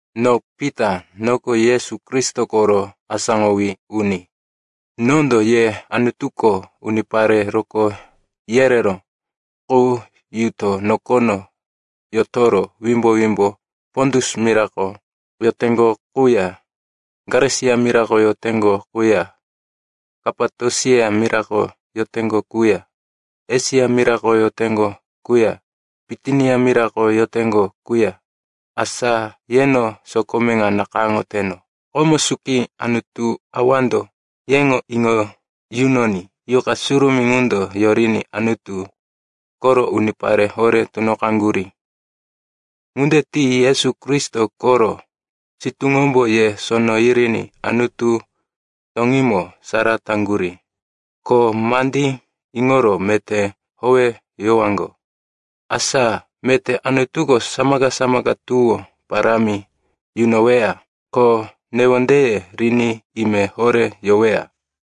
No Pita, noko Yesu Kristo koro asáŋowí uni. Nondo ye Anutuko unipare rokó yereró qu yuto nokono yotoro wimbo-wimbo Pontus mirako yoteŋgo quya Galesia mirako yoteŋgo quya Kapatosia mirako yoteŋgo quya Esia mirako yoteŋgo quya Bitinia mirako yoteŋgo qu, asa yeno sokome ŋa nakayáŋoteno. Komo suki Anutu Awando yeŋo iŋo yunoní Yuqa Surumí ŋundo yoriní Anutu koro unipare horé tunoqaŋgurí. Ŋunde ti Yesu Kristo koro sitúŋombo ye sono yiriní Anutu toŋímo sara taŋgurí, ko mandí iŋoro meté howeyowaŋgo. Asa meté Anutuko samaka-samaka tuwó parámi yunoweya, ko newondeye riní ime horé yoweya.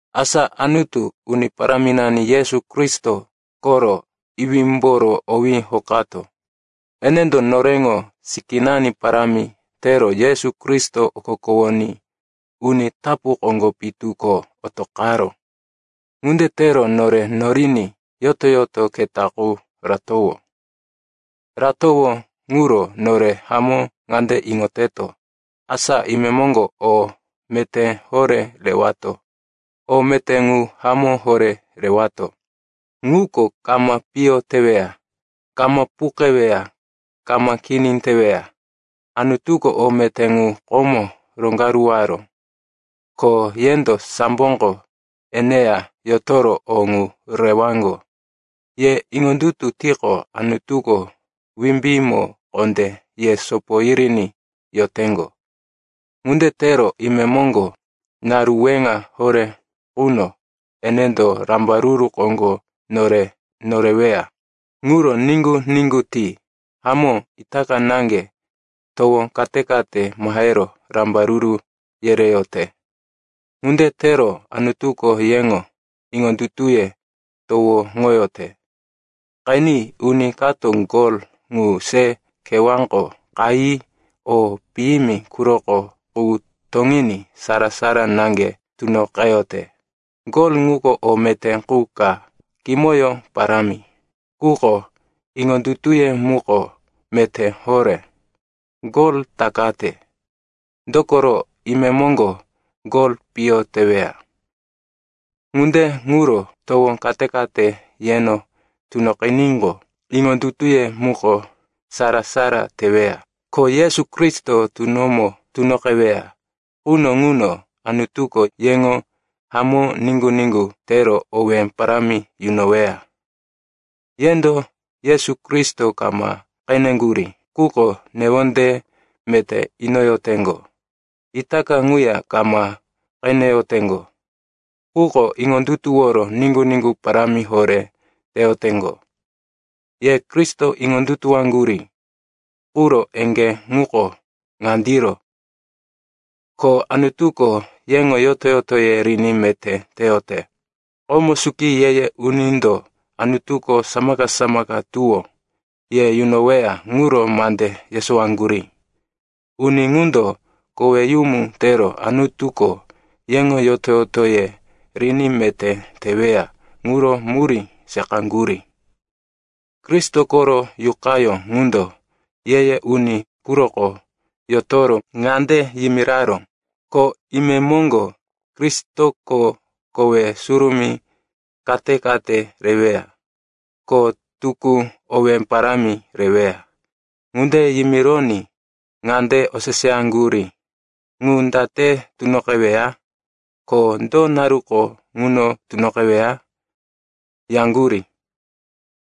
Asa Anutu, Uni Paráminani Yesu Kristo koro iwímboro owí hokato. Enendo noreŋo sikínani parámi tero Yesu Kristo okokowoní uni tapu koŋgo pitu ko otoqaró. Ŋunde tero nore noriní yoto-yoto keta qu ratowó. Ratowó ŋuro nore hamó ŋande iŋoteto, asa imemoŋgo o meté horé rewato. O meté ŋu hamó horé rewato. Ŋuko kama piyo teweya, kama puqeweya, kama kini teweya. Anutuko o meté ŋu komo roŋgaruwaró, ko yendo samboko eneya yotoro o ŋu rewaŋgo. Ye iŋondutu tiqo, Anutuko wimbímo kondé ye sopo yiriní yoteŋgo. Ŋunde tero imemoŋgo, naru weŋa horé quno enendo rambaruru koŋgo nore noreweya. Ŋuro niŋgu-niŋgu ti. Hamó, itaka naŋge towo kate-kate mahero rambaruru yereyote. Ŋunde tero Anutuko yeŋo iŋondutuye towoŋoyote. Qeni, uni kato gol ŋu se kewáko qayi o piyimi quroko qu toŋiní sara-sara naŋge tunoqeyote. Gol ŋuko o meté qu ka, kimoyó parámi. Quko iŋondutuye muko meté horé, gol takate. Dokoro imemoŋgo gol piyo teweya. Ŋunde ŋuro towo kate-kate yeno tunoqiníqo, iŋondutuye muko sara-sara teweya. Ko Yesu Kristo tunomo tunoqeweya quno ŋuno Anutuko yeŋo hamó niŋgu-niŋgu tero owé parámi yunoweya. Yendo Yesu Kristo kama qeneŋgurí, quko newonde meté inoyoteŋgo. Itaka ŋuya kama qeneyoteŋgo, quko iŋondutuworo niŋgu-niŋgu parámi horé teyoteŋgo. Ye Kristo iŋondutuwoyaŋgurí quro eŋgé ŋuko ŋandiro, ko Anutuko yeŋo yoto-yotoye riní meté teyote. Komo suki ye-ye unindo Anutuko samaka-samaka tuwó ye yunoweya ŋuro mande yesowaŋgurí. Uni ŋundo koweyumu tero Anutuko yeŋo yoto-yotoye riní meté teweya ŋuro murí seqaŋgurí. Kristo koro Yuqayó ŋundo ye-ye uni quroko yotoro ŋande yimiraró, ko imemoŋgo Kristoko kowe surumí kate-kate reweya, ko tukú owé parámi reweya. Ŋunde yimironí ŋande oseseyaŋgurí, “Ŋu date tunoqeweya?” ko “Do naruko ŋuno tunoqeweya?” yaŋgurí.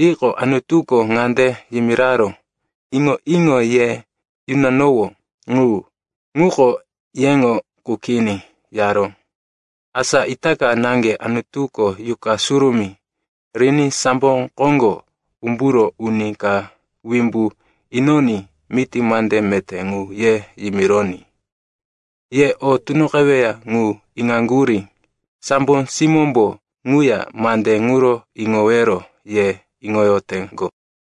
Yiqo, Anutuko ŋande yimiraró, “Iŋo-iŋo ye yunanowó ŋu, ŋuko yeŋo qu kini,” yaró. Asa itaka naŋge Anutuko Yuqa Surumí riní sambo koŋgo umburo uni ka wimbu inoní miti mande meté ŋu ye yimironí ye o tunoqeweya ŋu iŋaŋgurí. Sambo simómbo ŋuya mande ŋuro iŋowero ye iŋoyoteŋgo.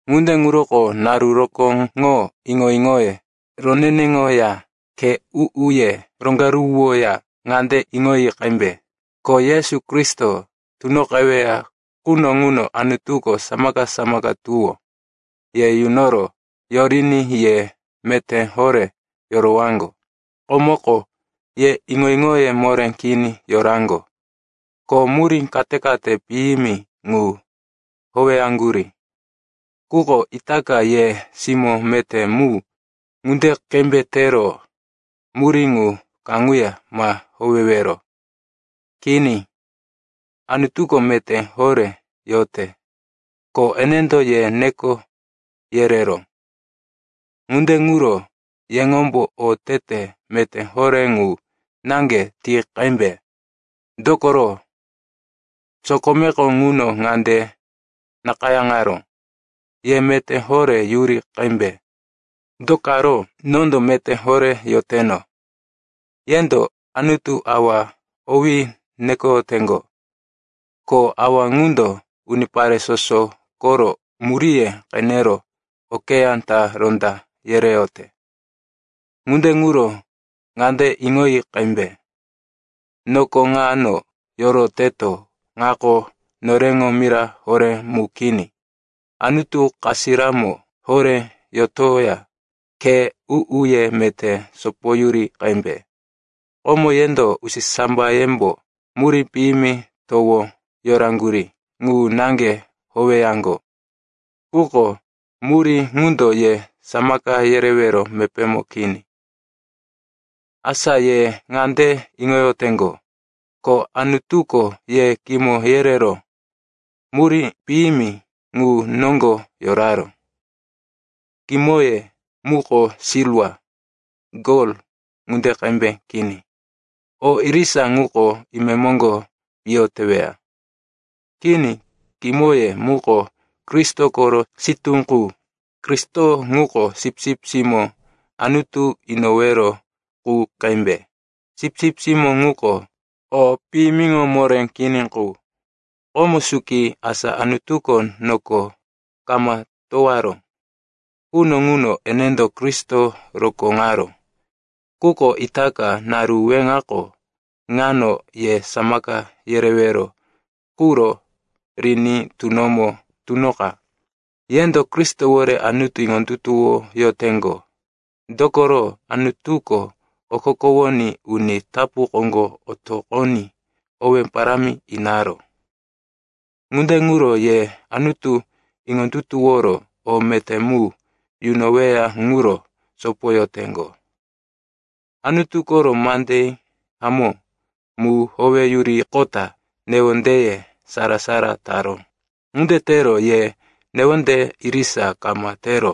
Ŋunde ŋuroko naru rokóŋo iŋo-iŋoye roneneŋoya khe u-uye roŋgaruwoya ŋande iŋoyi qembe, ko Yesu Kristo tunoqeweya quno ŋuno Anutuko samaka-samaka tuwó ye yunoro yoriní ye meté horé yorowaŋgo. Komoko ye iŋo-iŋoye moré kini yoraŋgo, ko murí kate-kate piyimi ŋu howeyaŋgurí. Quko itaka ye simó meté mu ŋunde qembe tero murí ŋu kaŋuya ma howewero. Kini. Anutuko meté horé yote, ko enendo ye neko yereró. Ŋunde ŋuro yeŋombo otete meté horé ŋu naŋge ti qembe. Dokoro sokomeko ŋuno ŋande nakayáŋaró, “Ye meté horé yuri qembe, do karo, nondo meté horé yoteno.” Yendo Anutu Awa owí nekoyoteŋgo, ko Awa ŋundo unipare soso koro muríye qenero okeyá ta ronda yereyote. Ŋunde ŋuro ŋande iŋoyi qembe, noko ŋano yoroteto ŋako noreŋo mira horé mu kini. Anutu kasiramo horé yotoya khe u-uye meté sopoyuri qembe. Komo yendo usisambayembo murí piyimi towo yoraŋgurí ŋu naŋge howeyaŋgo. Quko murí ŋundo ye samaka yerewero mepémo kini. Asa ye ŋande iŋoyoteŋgo, ko Anutuko ye kimo yerero murí piyimi ŋu noŋgo yoraró. Kimoye muko silwa, gol ŋunde qembe kini. O irisa ŋuko imemoŋgo piyo teweya. Kini, kimoye muko Kristo koro sitú qu. Kristo ŋuko sipsip simó Anutu inowero qu qembe, sipsip simó ŋuko o piyimiŋo moré kini qu. Komo suki, asa Anutuko noko kama towaró quno ŋuno enendo Kristo rokóŋaró. Quko itaka, naru weŋako ŋano ye samaka yerewero quro riní tunomo tunoqa. Yendo Kristowore Anutu iŋondutuwoyoteŋgo, dokoro Anutuko okokowoní uni tapu koŋgo otoqoní owé parámi inaró. Ŋunde ŋuro ye Anutu iŋondutuworo o meté mu yunoweya ŋuro sopoyoteŋgo. Anutu koro mande hamó mu howeyuriqota newondeye sara-sara taró. Ŋunde tero ye newonde irisa kama tero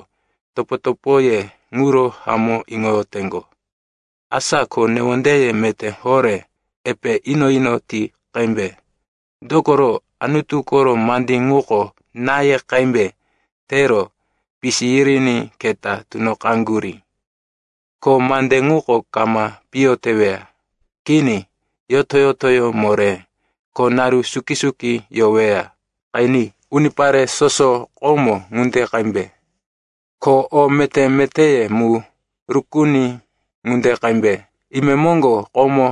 topo-topoye ŋuro hamó iŋoyoteŋgo. Asa ko newondeye meté horé epe ino-ino ti qembe. Dokoro Anutu koro mande ŋuko náye qembe tero pisi yiriní keta tunoqaŋgurí. Ko mande ŋuko kama piyo teweya. Kini, yoto-yotoyó moré, ko naru suki-suki yoweya. Qeni, “Unipare soso komó ŋunde qembe, ko o meté-metéye mu rukuni ŋunde qembe. Imemoŋgo komó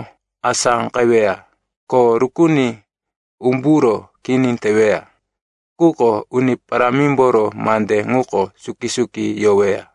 asáqeweya ko rukuni umburo kini teweya. Quko Uni Parámimboro mande ŋuko suki-suki yoweya.”